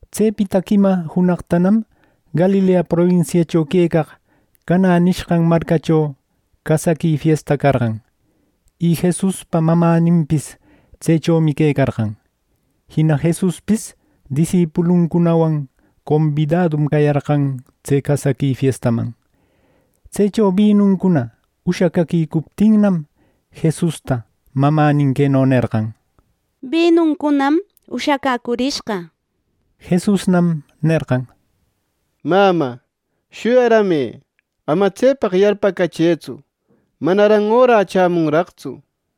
Tsepita quima junaqtanam Galilea probinsiacho quecaq Canä nishqan marcacho casaqui fiesta carqan. Y Jesuspa mamäninpis tsechomi quecarqan. Jina Jesuspis disipuluncunawan combidadum cayarqan tse casaqui fiestaman. Tsecho binuncuna ushacäquicuptinnam, Jesusta mamänin queno nerqan: —Binuncunam ushacäcurishqa —nishpa. Jesusnam nerqan: —Mamä, shuyarämë, ama tsepaq yarpacachëtsu. Manaran orä chämunraqtsu —nir.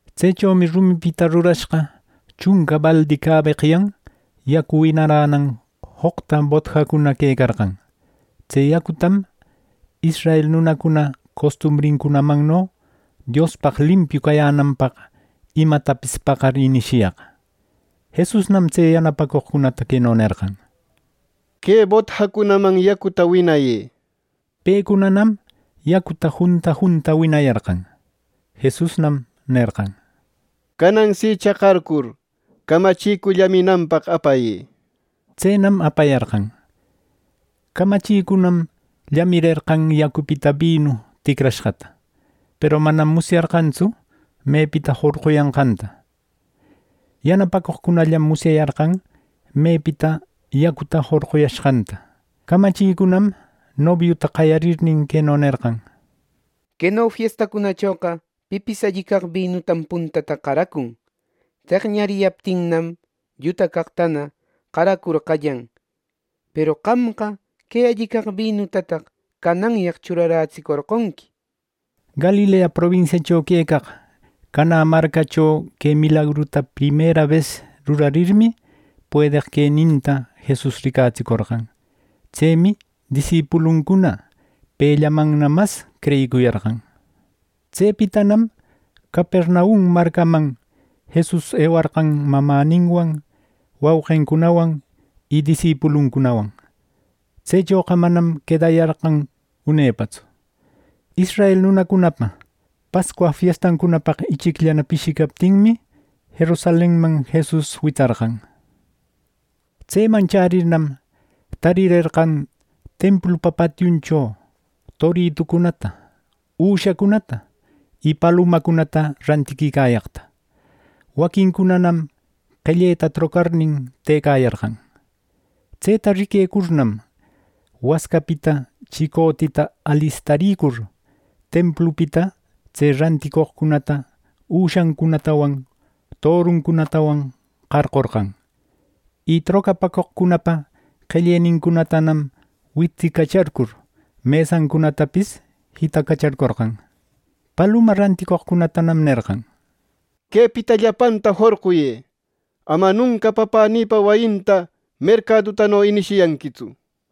Tsechomi rumipita rurashqa chunca baldi cabeqyan yacu winaränan joqta botjacuna quecarqan. Tse yacutam israel nunacuna costumbrincunamanno Diospaq limpiu cayänanpaq imatapis paqar inishiyaq. Jesusnam tse yanapacoqcunata queno nerqan: —Que botjacunaman yacuta winayë —nir. Pecunanam yacuta junta junta winariyarqan. Jesusnam nerqan: —Canan si chaqarcur, camachicu llaminanpaq apayë —nir. Tsenam apayarqan. Camachicunam llamirerqan yacupita binu ticrashqata, peru manam musyarqantsu mepita jorquyanqanta. (Yanapacoqcunallam musyayarqan mepita yacuta jorquyashqanta.) Camachicunam nobiuta qayarirnin, queno nerqan: —Queno fiestacunachoqa pipis alli caq binutam puntata qaracun. Teqñariyaptinnam, lluta caqtana qaracur qallan. ¡Peru qamqa que alli caq binutataq cananyaq churarätserqonqui! —nir. Galilea probinsiacho quecaq Canä marcacho que milagruta primera bes rurarirmi, puedeq queninta Jesus ricatsicorqan. Tsemi disipuluncuna pellamanna mas creyicuyarqan. Tsepitanam Capernaum marcaman Jesus ewarqan mamäninwan, wauqincunawan, y disipuluncunawan. Tsechoqa manam quedayarqan unepatsu. Israel nunacunapa Pascua fiestancunapaq ichicllana pishicaptinmi, Jerusalenman Jesus witsarqan. Tseman chärirnam, tarirerqan templupa patiuncho toritucunata, üshacunata, y palumacunata rantiquicayaqta. Waquincunanam qelleta trocarnin tëcayarqan. Tseta riquecurnam, wascapita chicotita alistaricur, templupita tse ranticoqcunata üshancunatawan toruncunatawan qarqorqan. Y trocapäcoqcunapa qellenincunatanam wictsicacharcur, mesancunatapis jitacacharcorqan. Paluma ranticoqcunatanam nerqan: —¡Quepita llapanta jorquyë! ¡Ama nunca Papänïpa wayinta mercadutano inishiyanquitsu! —nishpa.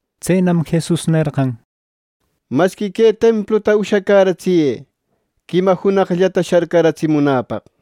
Tsenam Jesus nerqan: —Masqui que templuta ushacäratsiyë quima junaqllata sharcaratsimunäpaq —nir.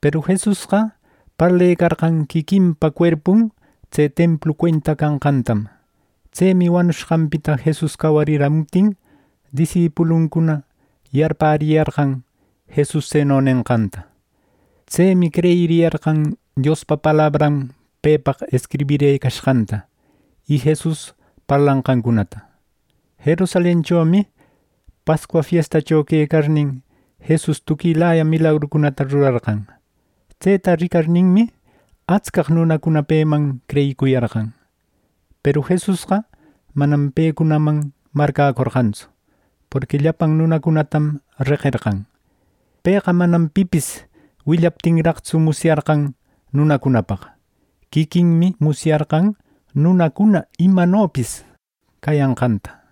Peru Jesusqa parlecarqan quiquinpa cuerpun tse templu cuenta canqantam. Tsemi wanushqanpita Jesus cawariramuptin, disipuluncuna yarpäriyarqan Jesus tseno nenqanta. Tsemi creyiriyarqan Diospa palabran pepaq escribirëcashqanta y Jesus parlanqancunata. Jerusalenchomi Pascua fiestacho quecarnin, Jesus tuquilaya milagrucuna rurarqan. Tseta ricarninmi, atscaq nunacuna peman creyiquicuyarqan. Peru Jesusqa manam pecunaman marcäcorqantsu, porqui llapan nunacunatam reqerqan. Pëqa manam pipis willaptinraqtsu, musyarqan nunacunapaq. Quiquinmi musyarqan nunacuna imanopis cayanqanta.